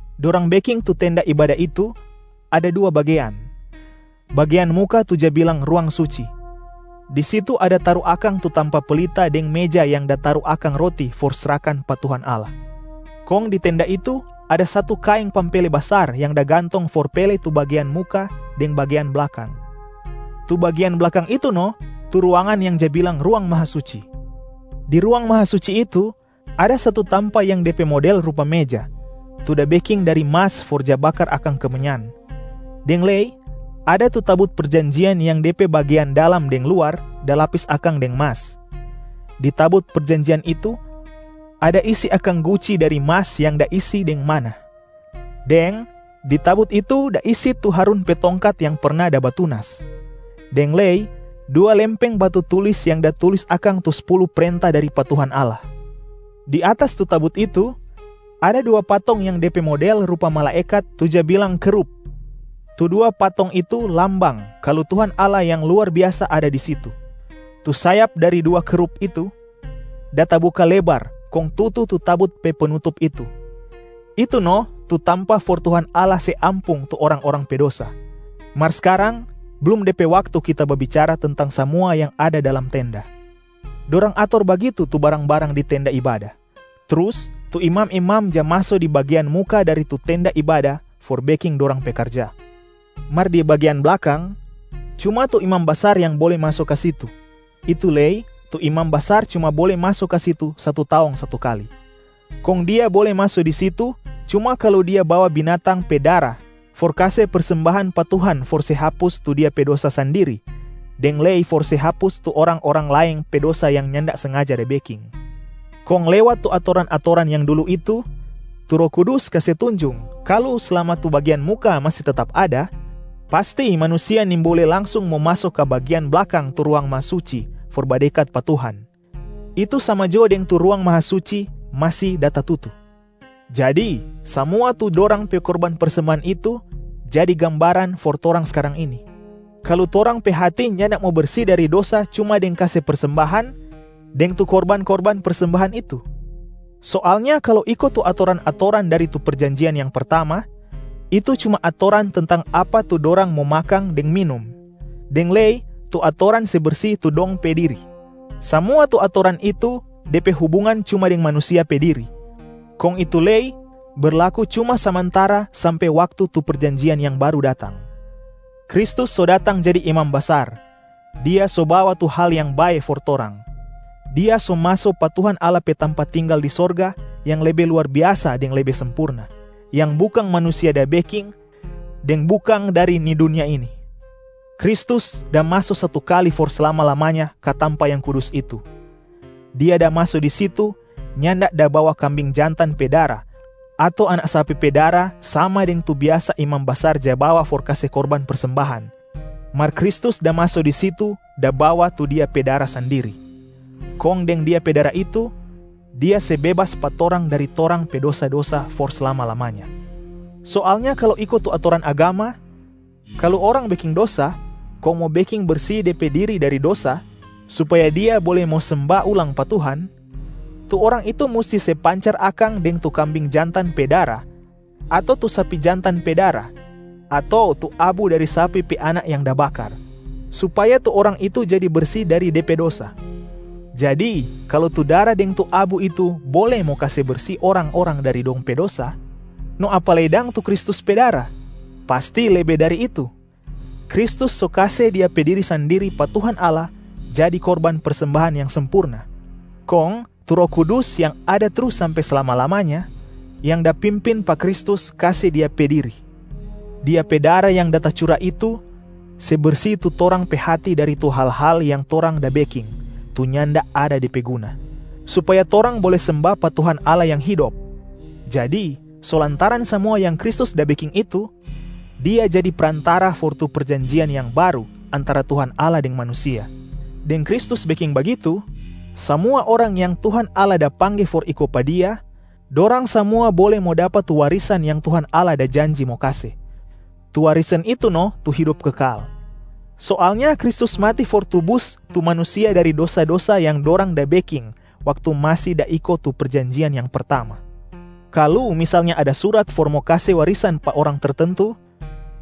Dorang beking tu tenda ibada itu ada dua bagean, bagean muka tu ja bilang Ruang Suci. Di situ ada taru akang tu tampa pelita deng meja yang da taru akang roti for srahkan pa Tuhan Allah. Kong di Tenda itu ada satu kaeng pampele basar yang da gantong for pele tu bagean muka deng bagean blakang. Tu bagean blakang itu no tu ruangan yang ja bilang Ruang Mahasuci. Di Ruang Mahasuci itu ada satu tampa yang de pe model rupa meja tu da beking dari mas for ja bakar akang kemenyan, deng lei ada tu tabut perjanjian yang de pe bagean dalam deng luar da lapis akang deng mas. Di tabut perjanjian itu ada isi akang guci dari mas yang da isi deng manna, deng di tabut itu da isi tu Harun pe tongkat yang perna da batunas, deng lei dua lempeng batu tulis yang da tulis akang tu spulu prenta dari pa Tuhan Allah. Di atas tu tabut itu ada dua patong yang de pe model rupa malaekat tu ja bilang kerub, tu dua patong itu lambang kalu Tuhan Allah yang luar biasa ada di situ. Tu sayap dari dua kerub itu da tabuka lebar kong tutu tu tabut pe penutup itu, itu no tu tampa for Tuhan Allah se ampung tu orang-orang pe dosa. Mar skarang blum de pe waktu kita babicara tentang samua yang ada dalam tenda. Dorang ator bagitu tu barang-barang di tenda ibada, trus tu imam-imam ja maso di bagean muka dari tu tenda ibada for beking dorang pe karja. Mar di bagean blakang, cuma tu imam basar yang bole maso ka situ, itu lei tu imam basar cuma bole maso ka situ satu taong satu kali. Kong dia bole maso di situ cuma kalu dia bawa binatang pe dara for kase persembahan pa Tuhan for se hapus tu dia pe dosa sandiri deng lei for se hapus tu orang-orang laeng pe dosa yang nyanda sengaja da beking. Kong lewat tu atoran-atoran yang dulu itu, tu Roh Kudus kase tunjung kalu slama tu bagean muka masi tetap ada, pasti manusia nimbole langsung mo maso ka bagean blakang tu Ruang Mahasuci for badekat pa Tuhan, itu sama jo deng tu Ruang Mahasuci masi da tatutu. Jadi samua tu dorang pe korban persembahan itu jadi gambaran for torang skarang ini, kalu torang pe hati nyanda mo bersi dari dosa cuma deng kase persembahan deng tu korban-korban persembahan itu. Soalnya kalu iko tu atoran-atoran dari tu perjanjian yang pertama, itu cuma atoran tentang apa tu dorang mo makang deng minum, deng lei tu atoran se bersi tu dong pe diri. Samua tu atoran itu de pe hubungan cuma deng manusia pe diri, kong itu lei berlaku cuma samantara sampe waktu tu perjanjian yang baru datang. Kristus so datang jadi Imam Basar, Dia so bawa tu hal yang bae for torang. Dia so maso pa Tuhan Allah pe tampa tinggal di sorga, yang lebe luar biasa deng lebe sempurna, yang bukang manusia da beking, deng bukang dari ni dunia ini. Kristus da maso satu kali for slama-lamanya ka tampa yang kudus itu. Dia da maso di situ nyanda da bawa kambing jantan pe dara ato anak sapi pe dara sama deng tu biasa imam basar ja bawa for kase korban persembahan, mar Kristus da maso di situ da bawa tu Dia pe dara sandiri. Kong deng Dia pe dara itu, Dia se bebas pa torang dari torang pe dosa-dosa for slama-lamanya. Soalnya kalu iko tu atoran agama, kalu orang beking dosa kong mo beking bersi de pe diri dari dosa supaya dia bole mo semba ulang pa Tuhan, tu orang itu musti se pancar akang deng tu kambing jantan pe dara ato tu sapi jantan pe dara ato tu abu dari sapi pe anak yang da bakar, supaya tu orang itu jadi bersi dari de pe dosa. Jadi kalu tu dara deng tu abu itu bole mo kase bersi orang-orang dari dong pe dosa, no apa lei dang tu Kristus pe dara, pasti lebe dari itu. Kristus so kase Dia pe diri sandiri pa Tuhan Allah jadi korban persembahan yang sempurna, kong tu Roh Kudus yang ada trus sampe slama-lamanya yang da pimpin pa Kristus kase Dia pe diri. Dia pe dara yang da tacura itu se bersi tu torang pe hati dari tu hal-hal yang torang da beking tu nyanda ada de pe guna, supaya torang bole semba pa Tuhan Allah Yang Hidop. Jadi so lantaran samua yang Kristus da beking itu, Dia jadi Prantara for tu perjanjian yang baru antara Tuhan Allah deng manusia. Deng Kristus beking bagitu samua orang yang Tuhan Allah da pangge for iko pa Dia, dorang samua bole mo dapa tu warisan yang Tuhan Allah da janji mo kase, tu warisan itu no tu hidop kekal. Soalnya Kristus mati for tubus tu manusia dari dosa-dosa yang dorang da beking waktu masi da iko tu perjanjian yang pertama. Kalu misalnya ada surat for mo kase warisan pa orang tertentu,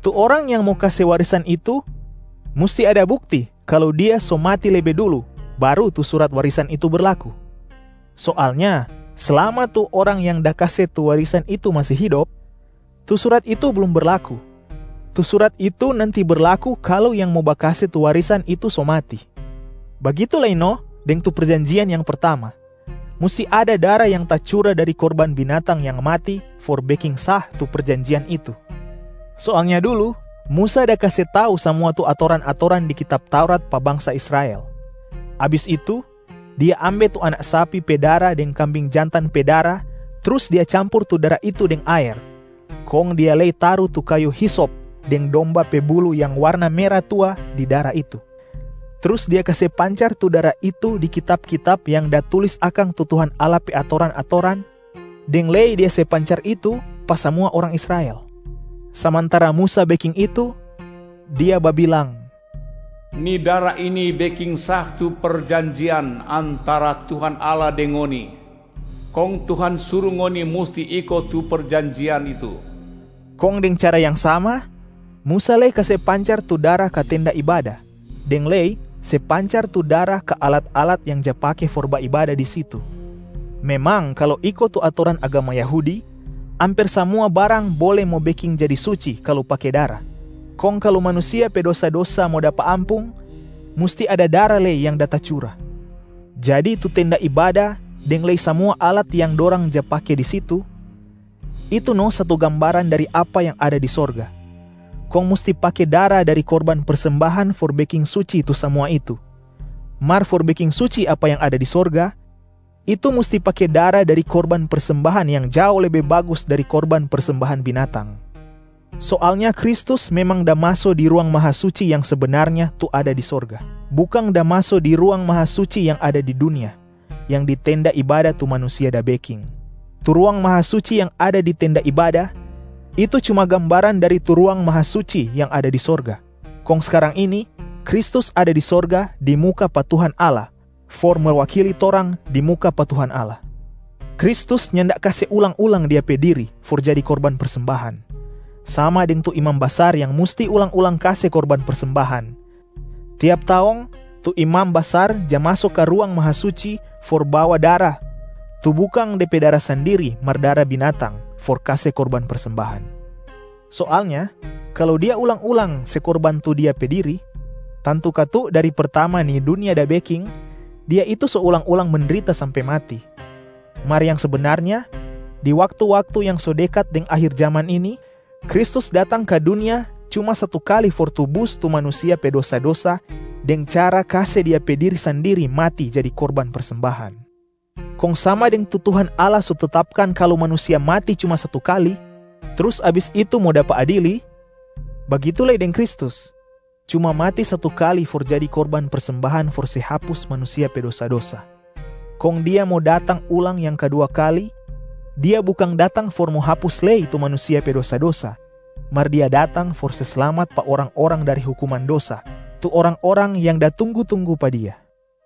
tu orang yang mo kase warisan itu musti ada bukti kalu dia so mati lebe dulu baru tu surat warisan itu berlaku. Soalnya slama tu orang yang da kase tu warisan itu masi hidop, tu surat itu blum berlaku. Tu surat itu nanti berlaku kalu yang mo bakase tu warisan itu so mati. Bagitu lei no deng tu perjanjian yang pertama, musti ada dara yang tacura dari korban binatang yang mati for beking sah tu perjanjian itu. Soalnya dulu Musa da kase tau samua tu atoran-atoran di kitab Taurat pa bangsa Israel. Abis itu dia ambe tu anak sapi pe dara deng kambing jantan pe dara trus dia campur tu dara itu deng aer, kong dia lei taru tu kayu hisop deng domba pe buluh yang warna mera tua di dara itu, trus dia kase pancar tu dara itu di kitab-kitab yang da tulis akang tu Tuhan Allah pe atoran-atoran, deng lei dia se pancar itu pa samua orang Israel. Samantara Musa beking itu, dia babilang, “Ni dara ini beking sah tu perjanjian antara Tuhan Allah deng ngoni, kong Tuhan suru ngoni musti iko tu perjanjian itu.” Kong deng cara yang sama, Musa lei kase pancar tu dara ka tenda ibada deng lei se pancar tu dara ka alat-alat yang ja pake for baibada di situ. Memang kalu iko tu atoran agama Yahudi, amper samua barang bole mo beking jadi suci kalu pake dara, kong kalu manusia pe dosa-dosa mo dapa ampung, musti ada dara lei yang da tacura. Jadi tu tenda ibada deng lei samua alat yang dorang ja pake di situ, itu no satu gambaran dari apa yang ada di sorga, kong musti pake dara dari korban persembahan for beking suci tu samua itu. Mar for beking suci apa yang ada di sorga, itu musti pake dara dari korban persembahan yang jao lebe bagus dari korban persembahan binatang. Soalnya Kristus memang da maso di Ruang Mahasuci yang sebenarnya tu ada di sorga, bukang da maso di Ruang Mahasuci yang ada di dunia, yang di tenda ibada tu manusia da beking. Tu Ruang Mahasuci yang ada di tenda ibada, itu cuma gambaran dari tu Ruang Mahasuci yang ada di sorga. Kong skarang ini Kristus ada di sorga di muka pa Tuhan Allah for mewakili torang di muka pa Tuhan Allah. Kristus nyanda kase ulang-ulang Dia pe Diri for jadi korban persembahan, sama deng tu imam basar yang musti ulang-ulang kase korban persembahan. Tiap taong, tu imam basar ja maso ka Ruang Mahasuci for bawa dara tu bukang de pe dara sandiri mar dara binatang for kase korban persembahan. Soalnya kalu Dia ulang-ulang se korban tu Dia pe diri, tantu katu dari pertama ni dunia da beking, Dia itu so ulang-ulang mendrita sampe mati. Mar yang sebenarnya, di waktu-waktu yang so dekat deng akhir jaman ini, Kristus datang ka dunia cuma satu kali for tubus tu manusia pe dosa-dosa deng cara kase Dia pe diri sandiri mati jadi korban persembahan. Kong sama deng tu Tuhan Allah so tetapkan kalu manusia mati cuma satu kali, trus abis itu mo dapa adili, bagitu lei deng Kristus cuma mati satu kali for jadi korban persembahan for se hapus manusia pe dosa-dosa. Kong Dia mo datang ulang yang kadua kali, Dia bukang datang for mo hapus lei tu manusia pe dosa-dosa, mar Dia datang for se slamat pa orang-orang dari hukuman dosa, tu orang-orang yang da tunggu-tunggu pa Dia.